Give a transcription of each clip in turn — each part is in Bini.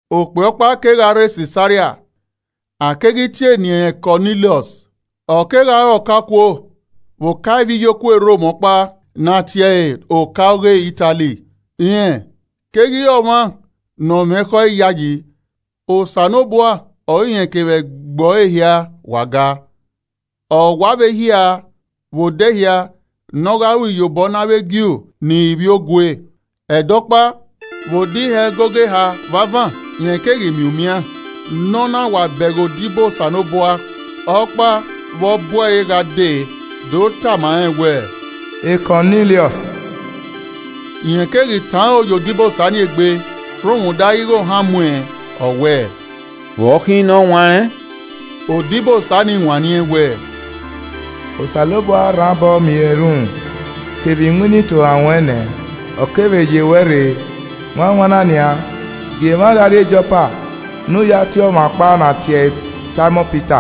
Okpia ọkpa kegha rre Sisaria, a keghi tie eni ẹnrẹn Kọniliọs. Ọ kegha re ọkaokuo vbe oka ivbiyokuo e Rom ọkpa ne a tie ẹre “Ọka ọghe Itali.” Rẹn keghi re ọmwa ne ọ mwẹ ekhọe iyayi. Osanobua ọre irẹn kevbe ẹgbẹe ọre hia wa gaa. Ọ wa vbe hia vbe odẹ hia ne ọ gha ru iyobọ ne avbe Ju ni re ivbiogue. Ẹdẹ ọkpa, vbe odẹ ihe ẹgogo eha vbe avan, rẹn keghi miẹn umian ne ọ na wa bẹghe odibo Osanobua ọkpa vbe ọ bu ẹre gha dee do tama rẹn wẹẹ, “Kọniliọs!” Rẹn keghi tọn aro ye odibosa ni egbe rhunmwuda ighẹ ohan mu ẹn, ọ wẹẹ, “Vbe ọ khin nọwanrẹn?” Odibosa nii wanniẹn wẹẹ, “Osanobua rhan obọ miẹn erhunmwu kevbe iwinna itohan ruẹn nẹ, ọ kevbe ye ruẹ rre. Wanwanna nian, gie emwa gha rrie Jopa ne u ya tie ọmwa ọkpa ne a tie ẹre Saimọn Pita.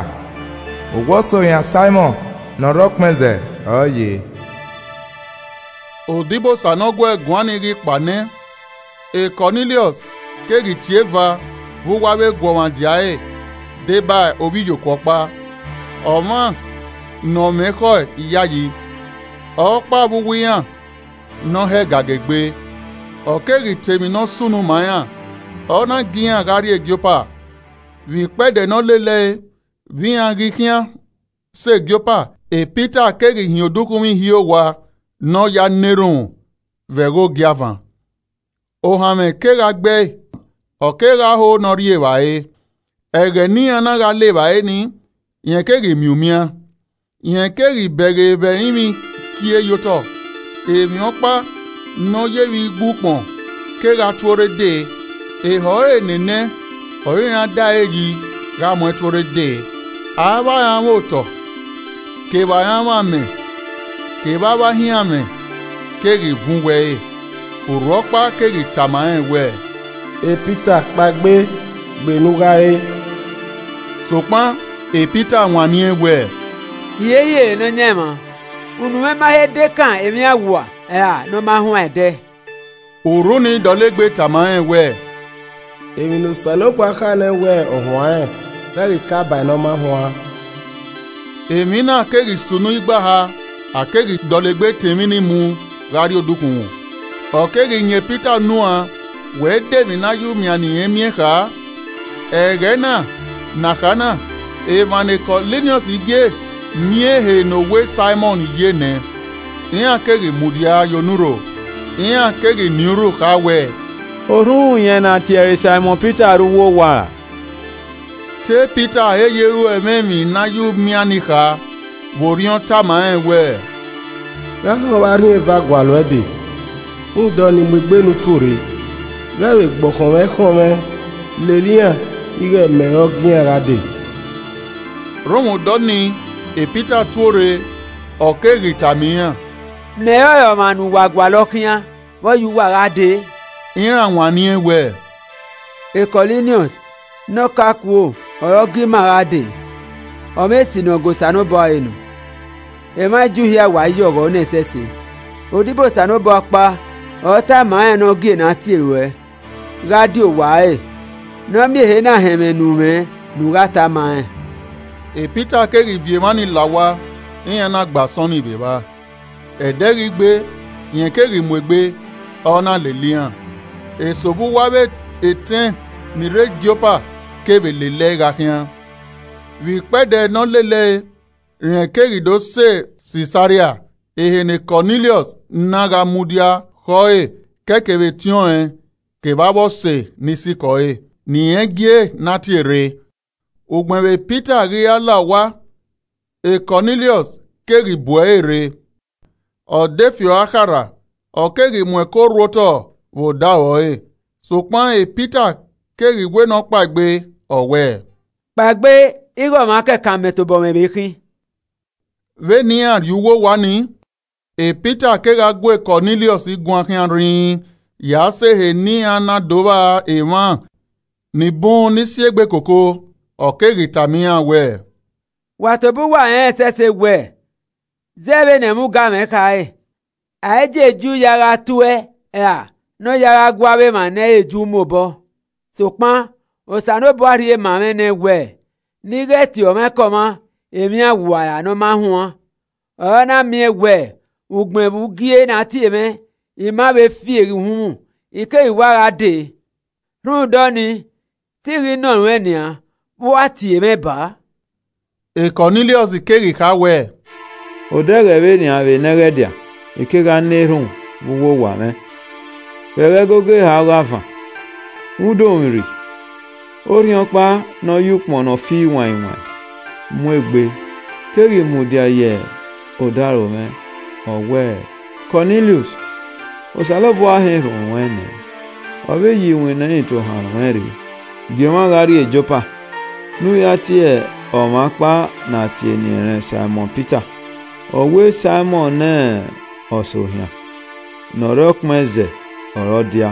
Owa Ọsohian Saimọn ne ọ rre ọkpẹn ẹzẹ ọre ọ ye.” Odibosa ne ọ gu ẹe guan nii ghi kpao nẹ, Kọniliọs keghi tie eva vbe uwu avbe eguọmwadia ẹre deba ovbiyokuo ọkpa, ọmwa, ne ọ mwẹ ekhọe iyayi, ọkpa vbe uwu iran ne ọ hẹ gaga egbe. Ọ keghi ta emwi ne ọ sunu ma iran, ọ na gie iran gha rrie Jopa. Vbe ikpẹdẹ ne ọ lele ẹe vbe iran ghi khian sẹ Jopa, Pita keghi hin odukhunmwu ihie owa ne ọ ya na erhunmwu vbe ẹghẹ ogiavan. Ohanmwẹ kegha gbe ẹe, ọ kegha ho ne ọ rri evbare. Ẹghẹ ne iran na gha le evbare nii, rẹn keghi miẹn umian. Rẹn keghi bẹghe vbe ẹrinmwi kie ye otọ, emwi ọkpa ne ọ ye vbe igbu ukpọn kegha tuorre dee, ehọ ẹre enenẹ ọre iran da ẹre yi gha mu ẹn tuorre dee. Avbe aranmwẹ otọ kevbe aranmwẹ amẹ kevbe avbe ahianmwẹ keghi vuọn uwu ẹre. Urhu ọkpa keghi tama rẹn wẹẹ, “Pita kpaegbe, gbe ne u gha re.” Sokpan Pita wanniẹn wẹẹ, “Hiehiere Nọyaẹnmwa, unu mwẹ ma he dekan emwi awua ra nọ ma huan ẹdẹ.” Urhu ni dọlegbe tama rẹn wẹẹ, “Emwi ne Osanobua kha nẹ wẹ ọ huanrẹn, ghẹ ghi kae ba ne ọ ma huan.” Emwi na keghi sunu igba eha, a keghi dọlegbe tọn emwi ni mu gha rrie odukhunmwu. Ọ keghi yan Pita unu uan wẹ de emwi ne a ya umian ne irẹn miẹn kha. Ẹghẹ na ne a kha na, emwa ne Kọniliọs gie miẹn ehe ne owa Saimọn ye nẹ, iran keghi mudia ye onurho. Iran keghi nien urhu kha wẹẹ, “Orhunmwuyẹn ne a tie ẹre Saimọn Pita rre uwu owa ra?” Te Pita he ye ro ẹmwẹ emwi ne a ya umian nii kha vbe Orhiọn tama rẹn wẹ “Gha họn vbe arhin eha gualọ uẹ dee. Rhunmwuda ọnii mu egbe ne u tuorre, ghẹ vbe gbe ọkhọnmwẹ ẹ i khọnmwẹ lele iran ighẹ mẹ ọre ọ gie iran gha dee.” Rhunmwuda ọnii Pita tuorre, ọ keghi tama iran, “Mẹ ọrọre ọmwa ne uwa gualọ khian. Vbe ọ ya uwa gha dee?” Iran wanniẹn wẹẹ, “Kọniliọs ne ọka okuo ọre ọ gie ima gha dee. ọmwa esi ne ọ ga Osanobua ọre nọ, emwa Ju hia wa ya ọghọ nẹẹn ẹsẹse. Odibo Osanobua ọkpa ọre ọ tama rẹn ne ọ gie ne a tie ruẹ gha die owa ẹre, ne ọ miẹn ehe na họn ẹmwẹ ne u mwẹ ne u gha ta ma rẹn.” Pita keghi viọ emwa ni la owa iran na gbe asọn nii vbe evba. Ẹdẹ ghi gbe, rẹn keghi mu egbe, ọ na lele iran, eso vbe uwu avbe etẹn ni rre Jopa kevbe lele ẹe gha khian. Vbe ikpẹdẹ ne ọ lele ẹe rẹn keghi do sẹ Sisaria, ehe ne Kọniliọs na gha mudia khẹ ọre ke ẹe kevbe etiọnrẹn kevbe avbe ọse ni sikẹ ọre, ne irẹn gie ne a tie rre. Ugbẹn vbe Pita ghi ra la owa, Kọniliọs keghi bu ẹre rre, ọ de fi ọre akharha, ọ keghi mu ẹko rhu otọ vbe odaro ẹre. Sokpan Pita keghi wẹ ne ọ kpaegbe, ọ wẹẹ, “Kpaegbe ighẹ ọmwa kẹkan mẹ tobọ mwẹ vbe khin.” Vbene iran rrie uwu owa nii, Pita kegha gu Kọniliọs guan khian rhinrin ya sẹ ehe ne iran na do vba emwa ni bun ni si egbe koko. Ọ keghi tama iran wẹ, “Wa tobọ uwa rẹnrẹn ẹsẹse wẹ, zẹ vbe ne ẹmwẹ ugamwẹ khare, a i gie Ju ya gha tuẹ, ra ne ọ ya gha gu avbe emwa ne ẹ i re Ju mu obọ. sokpan Osanobua rhie ma mwẹ nẹ wẹ ne I ghẹ tie ọmwaikọmwa emwi awua ra ne ọ ma huan. Ọre a na miẹn wẹ ugbẹn vbe u gie ne a tie mwẹ, I ma vbe fieghe uhunmwu, I keghi wa gha dee. Rhunmwuda ọnii te I ghi nọ ruẹn nian, vbe u a tie mwẹ baa?” Kọniliọs keghi kha wẹẹ, “Odẹ ẹghẹ vbe nian vbe nẹghẹdia, I kegha na erhunmwu vbe uwu owa mwẹ, vbe ẹghẹ ẹgogo eha ọghe avan. Vbe udomwurri, orhiọnkpa ne ọ ya ukpọn nọ fi wain wain mu egbe, keghi mudia ye odaro mwẹ, ọ wẹẹ, ‘Kọniliọs, Osanobua họn erhunmwu ruẹn nẹ, ọ vbe ye iwinna itohan ruẹn rre. Gie emwa gha rrie Jopa ne u ya tie ọmwa ọkpa ne a tie eni ẹnrẹn Saimọn Pita. Owa Saimọn ne Ọsohian ne ọ rre ọkpẹn ẹzẹ ọre ọ dia.’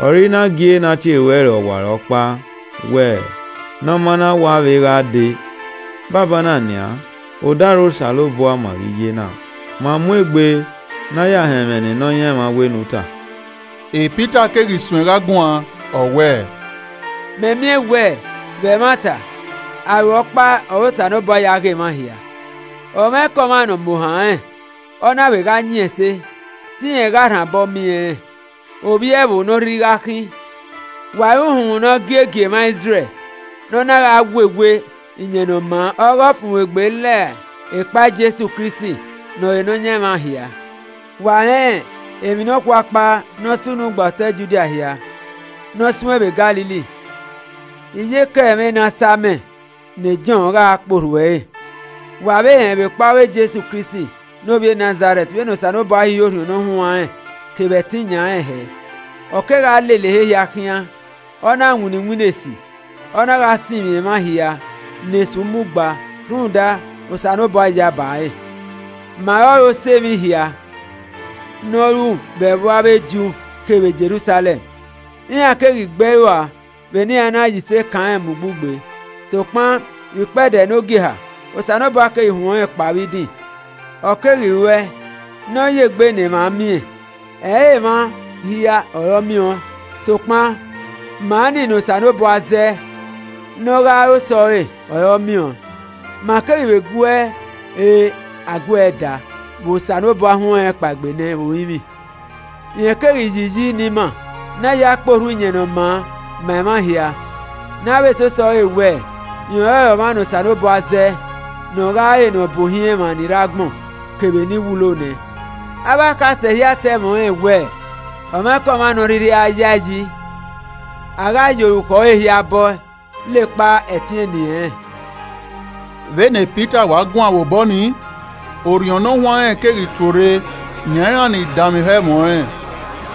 Ọre I na gie ne a tie ruẹ rre ọwarọkpa, wẹ ne ọ maa na wa vbe gha dee. Banbanna nian, odaro Osanobua ma ghi ye na, ma mu egbe ne a ya họn ẹmwẹ ne Nọyaẹnmwa wẹ ne u ta.” Pita keghi suẹn gha guan ọ wẹẹ, “Mẹ miẹn wẹ vbe ẹmwata, aro ọkpa ọre Osanobua ya ghe emwa hia. Ọmwaikọmwa ne ọ mu ohan rẹn, ọ na vbe gha yin ẹse, te irẹn gha rhan obọ miẹn rẹn, ovbi ẹvbo ne ọ rhirhi gha khin. Wa rẹn uhunmwu ne ọ gie gie emwa Izrẹl ne ọ na gha wewe Iyẹn Ne ọ maa ọghe ọfumwegbe la ekpa Jesu Kristi ne ọre Nọyan emwa hia. Wa rẹn emwi nọkhua ọkpa ne ọ sunu gba otọ Judia hia, ne ọ suẹn vbe Galili, iyeke ẹmwẹ e na sa amẹ ne Jọn gha kpe orhu ẹre. Wa vbe rẹn vbekpa ọghe Jesu Kristi ne ovbi e Nazarẹt vbene Osanobua hihiẹ Orhiọn Ne Ọ Huanrẹn kevbe ẹtin yan rẹn hẹẹ. Ọ kegha lele ehe hia khian, ọ na winna iwinna esi, ọ na gha sinmwi emwa hia ne Esu mu gba, rhunmwuda Osanobua yaba ẹre. Ma ọrọre osẹe emwi hia ne ọ ru vbe ẹvbo avbe Ju kevbe Jerusalẹm. Iran keghi gbe ẹe rua vbe ne iran na ya ise kan rẹn mu ugbugbe. Sokpan vbe ikpẹdẹ ne ogieha, Osanobua keghi huẹn ọnrẹn kpao vbe idin, ọ keghi ruẹe ne ọ ye egbe ne emwa miẹn. Ẹ i re emwa hia ọre ọ miẹn ọẹn, sokpan ma ni ne Osanobua zẹ nẹ ne ọ gha re osẹe, ọre ọ miẹn ọẹn. Ma keghi guẹe re a guẹe da vbe Osanobua huẹn ọnrẹn kpaegbe nẹ vbe orinmwi. Rẹn keghi yi iyi ne ima ne a ya kpe orhu Iyẹn Ne ọ maa ma emwa hia, ne a vbe sẹ osẹe ọre wẹ rẹn ọrọre ọmwa ne Osanobua zẹe ne ọ gha re ne ọbuohiẹn emwa ni rre agbọn kevbe ni wulo nẹ. Avbe akhasẹ hia ta ẹmwẹ ọnrẹn wẹ ọmwaikọmwa ne ọ rhirhi a yae yi, a gha ya orukhọ ẹre hia bọ ẹe la ekpa ẹtin eni ẹnrẹn.” Vbene Pita wa guan vbe obọ nii, Orhiọn Ne Ọ Huanrẹn keghi tuorre yan iran ni danmwehọ ẹmwẹ ọnrẹn.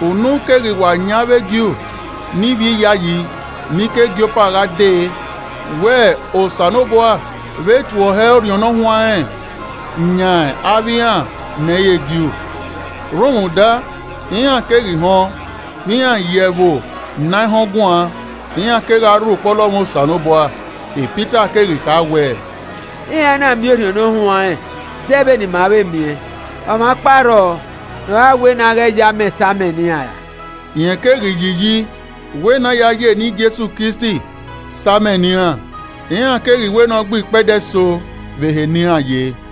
Unu keghi wa yan avbe Ju ne ivbi iyayi ni ke Jopa gha dee wẹ Osanobua vbe tue ọhẹ Orhiọn Ne Ọ Huanrẹn yan avbe iran ne ẹ i re Ju. Rhunmwuda, iran keghi họn vbe iran ya ẹvbo ne a i họn guan, iran kegha rho ukpọlọmwẹ Osanobua. Pita keghi kha wẹẹ, “Iran na miẹn Orhiọn Ne Ọ Huanrẹn zẹ vbene ima vbe miẹn. Ọmwa ọkpa rrọọ ne ọ gha wẹ ne a ghẹ ye amẹ sa amẹ ne iran ra?” Rẹn keghi yi iyi wẹ ne a ya eni Jesu Kristi sa amẹ ne iran. Iran keghi wẹ ne ọ gbe ikpẹdẹ eso vbe ehe ne iran ye.